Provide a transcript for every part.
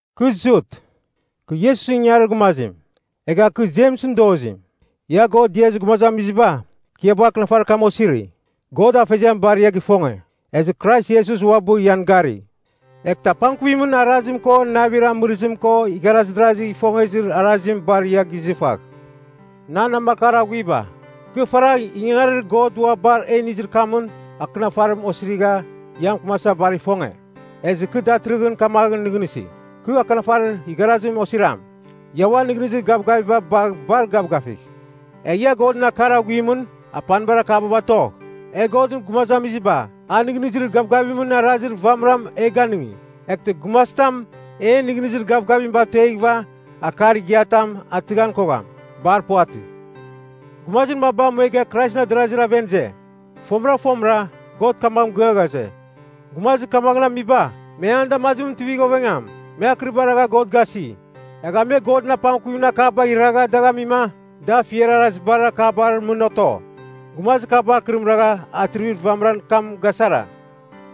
Kɨ Jut, kɨ Iesusɨn ingangarir gumazim; egha kɨ Jemsɨn dozim. Ia God diazir gumazamiziba, kɨ ia bagha akɨnafarir kam osiri. God Afeziam bar ia gifonge, ezɨ Krais Iesus uabɨ ian gari. Eghtɨ apangkuvimɨn arazim ko navir amɨrɨzim ko igharaz darazi gifongezir arazim bar ia gizɨfagh. Nan namakar aghuiba, kɨ faragh ingangarir God ua bar e inizir kamɨn, akɨnafarim osirigha ia mɨkɨmasa bar ifonge. Ezɨ kɨ datɨrɨghɨn kamaghɨn nɨghnɨsi, kɨ akɨnafarir igharazim osiram. Ia uan nɨghnɨzir gavgaviba bagh bar gavgafigh. Egh ia Godɨn akar aghuimɨn apanibar akaba batogh. E Godɨn gumazamiziba, a nɨghnɨzir gavgavimɨn arazir vamɨram e ganɨngi. Eghtɨ gumazitam en nɨghnɨzir gavgavim batueghɨva, akar igiatam atɨghan kogham. Bar puvatɨ. Gumazir maba muega Kraisɨn adarazir aven ize. Fomɨra fomɨra God kamaghɨn mɨgɨa ghaze, gumazir kamaghɨn amiba me an damazimɨn mɨtivigh ovengam. Me akɨriba ragha God gasi. Egha me Godɨn apangkuvimɨn akabagh iragha dagh amima, da afiar arazibar akabar mɨn oto. Gumazir kaba akɨrim ragha Atrivir vamɨran kam gasara.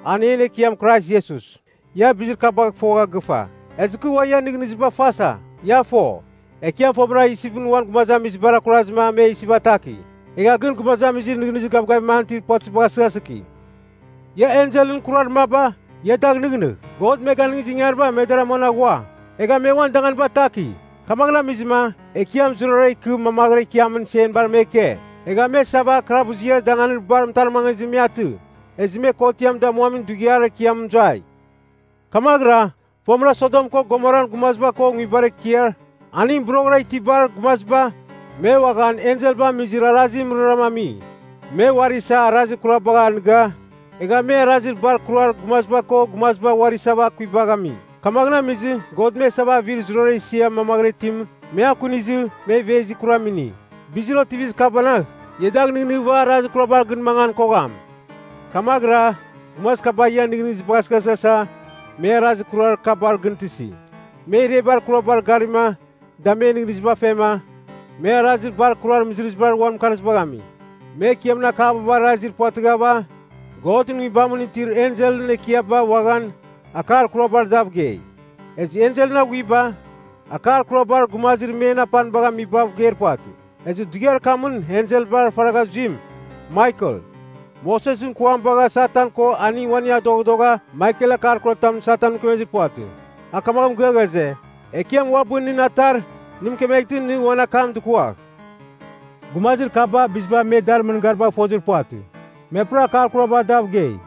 An en Ekiam Krais Iesus. Ia bizir kabagh fogha gɨfa, ezɨ kɨ ua ian nɨghnɨziba fasa. Ia fo, Ekiam fomɨra Isipɨn uan gumazamizibar akurazɨma me Isip ataki. Egha gɨn gumazamizir nɨghnɨzir gavgavim an itir puvatɨzibagh asɨghasɨki. Ia enselɨn kurar maba, ia dagh nɨghnɨgh. God me ganɨngizir ingangariba me dar amuan aghua. Egha me uan danganiba ataki. Kamaghɨn amizima, Ekiam zurara ikɨ mamaghɨra ikiamin senbar me ike. Egha me isava kalabuziar danganir bar mɨtarmangizɨmɨn me atɨ. Ezɨ me Kotiam Damuamin Dughiar Ekiam mɨzuai. Kamaghɨra, fomɨra Sodom ko Gomoran gumaziba ko nguibar ekiar aningɨn boroghɨra itibar gumaziba, me uaghan enselba amizir arazimɨn mɨrara ami. Me uari isa arazir kurabagh anɨga, egha me arazir bar kurar gumaziba ko gumaziba uari isava akuibagh ami. Kamaghɨn amizɨ God me isava avir zurara isia mamaghɨra itim, me akunizɨ, me ivezir kuram ini. Bizir otivizir kabanagh, ia dagh nɨghnɨghɨva arazir kurabar gɨn mangan kogham. Kamaghɨra gumazir kaba ian nɨghnɨzibagh asɨghasɨghasa me arazir kurar kabar gɨn tɨsi. Me irebar kurabar garima da men nɨghnɨziba fema me arazir bar kurar mɨzɨrɨzibar uan mɨkarzibagh ami. Me Ekiamɨn akaba barazir puvatɨghava, Godɨn Nguibamɨn itir enselɨn ekiaba uaghan akar kurabar dav gei. Ezɨ enselɨn aghuiba, akar kurabar gumazir men apanibagh amibav geir puvatɨ. Ezɨ dughiar kamɨn enselbar faragha zuim Maikel, Mosesɨn kuam bagha Satan ko aning uaning adoghadogha Maikel akar kuratam Satanɨn mɨkemezir puvatɨ. A kamaghɨn mɨgɨa ghaze, “Ekiam uabɨ nɨn atar nɨ mɨkemeghtɨma nɨ uan akam dɨkuagh.” Gumazir kaba biziba me dar mɨngaribagh fozir puvatɨ, me puram akar kurabar dav gei.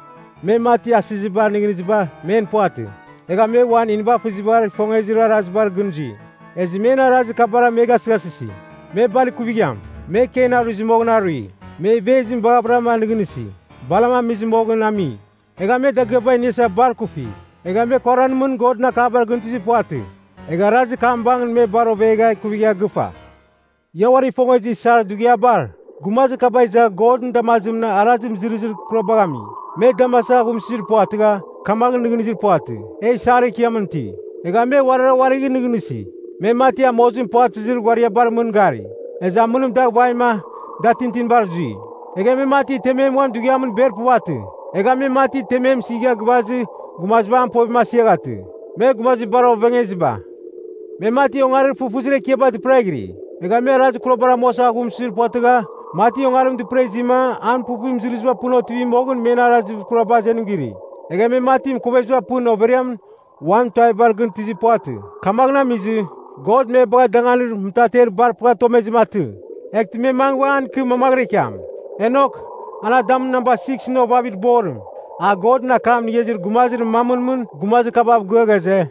Me mati asɨziba nɨghnɨziba men puvatɨ. Egha me uan nivafɨzibar ifongezir arazibar gɨn zui. Ezɨ men arazir kabara me gasɨghasɨsi. Me bar ikuvigham! Me Kein aruizɨ moghɨn arui. Me ivezim baghavɨra nɨghnɨsi, Balam amizɨ moghɨn ami. Egha me dagɨaba iniasa bar ikufi. Egha me Koran mɨn Godɨn akabar gɨn tɨzir puvatɨ, egha arazir kam bangɨn me bar ovegha ikuvigha gɨfa. Ia uari ifongezir isar dughiabar, gumazir kaba izava Godɨn damazimɨn arazir mɨzɨrɨzir kurabagh ami. Me damasa aghumsɨzir puvatɨgha, kamaghɨn nɨghnɨzir puvatɨ, e isar ekiamɨn iti. Egha me uarira uarigh nɨghnɨsi. Me mati amozim puvatɨzir ghuariabar mɨn gari, ezɨ amɨnim dagh vaima, da tintinibar zui. Egha me mati temem uan dughiamɨn ber puvatɨ. Egha me mati temem mɨsiga gɨvazɨ gumaziba an povim asiaghatɨ. Me gumazir bar ovengeziba. Me mati ongarir fɨfɨzir ekiaba dɨpɨraghiri. Egha me arazir kurabar amuasa aghumsɨzir puvatɨgha, mati ongarim dɨpɨra izima an puvpuvir mɨzɨrɨziba pɨn otivi moghɨn men arazir kuraba azenim giri. Egha me mati mɨkoveziba pɨn overiamɨn uan tuavibar gɨn tɨzir puvatɨ. Kamaghɨn amizɨ, God me bagha danganir mɨtarmer bar pɨghatomezim atɨ, eghtɨ me mangɨ an ikɨ mamaghɨra ikiam. Enok, an Adamɨn namba siksɨn ovavimɨn borim, a Godɨn akam inigha izir gumazir mamɨn mɨn gumazir kabav gɨa ghaze,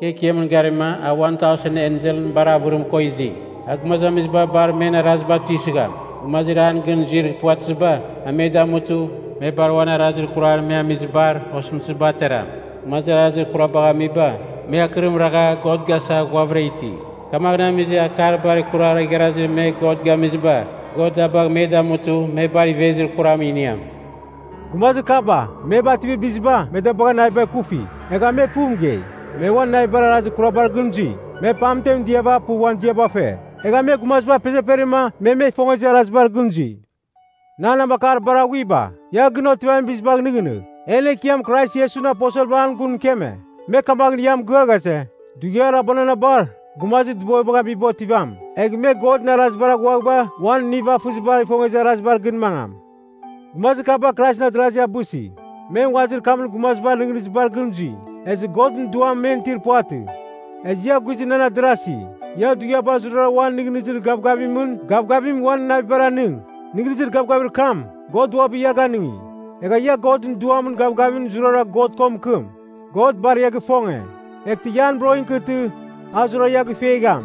“Kɨ Ekiamɨn garima a uan tausen enselɨn bar avɨravɨrim ko izi. A gumazamiziba bar men araziba tuisɨgham. Gumazir an gɨn zuir puvatɨziba, a me damutɨ, me bar uan arazir kurar me amizibar osɨmtɨziba ateram. Gumazir arazir kurabagh amiba, me akɨrim ragha God gasa ghuavɨra iti. Kamaghɨn amizɨ akar bar kurar igharazir me God gamiziba, God da bagh me damutɨ me bar ivezir kuram iniam.” Gumazir kaba, me bativir biziba me da bagha naviba ikufi, egha me puv mɨgei. Me uan navibar arazir kurabar gɨn zui. Me pamtemɨn diava puv uan ziaba fe. Egha me gumaziba apezeperima me me ifongezir arazibar gɨn zui. Nan namakar bar aghuiba, ia gɨn otivamin bizim gɨnɨghnɨgh, en Ekiam Krais Iesusɨn aposelba an gun mɨkeme. Me kamaghɨn ia mɨgɨa ghaze, “Dughiar abuananabar, gumazir dɨbovibagh amiba otivam, egh me Godɨn arazibar aghuaghɨva uan nivafɨziba ifongezir arazibar gɨn mangam.” Gumazir kaba Kraisɨn adarazi abɨsi. Me nguazir kamɨn gumazibar nɨghnɨzibar gɨn zui, ezɨ Godɨn Duam men itir puvatɨ. Ezɨ ia guizɨn nan adarasi, ia dughiabar zurara uan nɨghnɨzir gavgavimɨn gavgavim uan navibar anɨng. Nɨghnɨzir gavgavir kam, God uabɨ ia ganɨngi. Egh ia Godɨn Duamɨn gavgavimɨn zurara God ko mɨkɨm. God bar ia gifonge. Eghtɨ ia an boroghɨn ikɨtɨ a zurara ia gifuegham.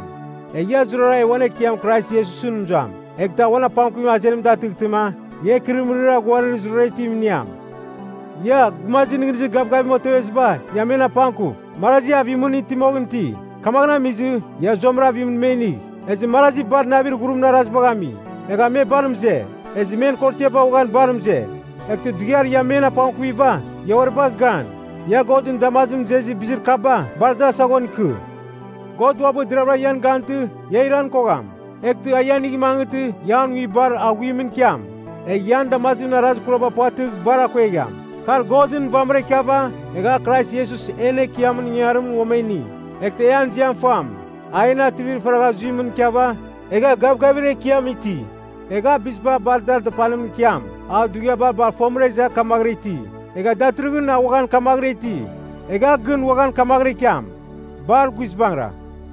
Egh ia zurara e uan Ekiam Krais Iesusɨn mɨzuam, eghtɨ a uan apangkuvim azenim datɨghtɨma, ia ikɨrɨmɨrir aghuarir zurara itim iniam. Ia, gumazir nɨghnɨzir gavgavim oteveziba, ia men apangkuf. Marazi avimɨn iti moghɨn iti, kamaghɨn amizɨ, ia zuamram avimɨn me inigh. Ezɨ marazi bar navir ghurimɨn arazibagh ami, egha me bar mɨze, ezɨ men korotiaba uaghan bar mɨze. Eghtɨ dughiar ia men apangkuviba, ia uari bagh gan. Ia Godɨn damazimɨn mɨzezir bizir kaba bar dar saghon ikɨ. God uabɨ deraghvɨra ian gantɨ ia iran kogham. Eghtɨ a ia inigh mangɨtɨ ia an nguibar aghuimɨn ikiam. Egh ia an damazimɨn arazir kuraba puvatɨgh, bar akuegham. Kar Godɨn vamɨra ikiava, egha a Krais Iesus en Ekiamɨn ingangarimɨn, uam e ini. Eghtɨ e an ziam fam. A en atrivir faragha zuimɨn ikiava, egha gavgavir ekiam iti. Egh a biziba bar dar dapanimɨn ikiam. A dughiaba bar fomɨra iza kamaghɨra iti. Egha datɨrɨghɨn a uaghan kamaghɨra iti. Egh a gɨn uaghan kamaghɨra ikiam. Bar guizbangɨra.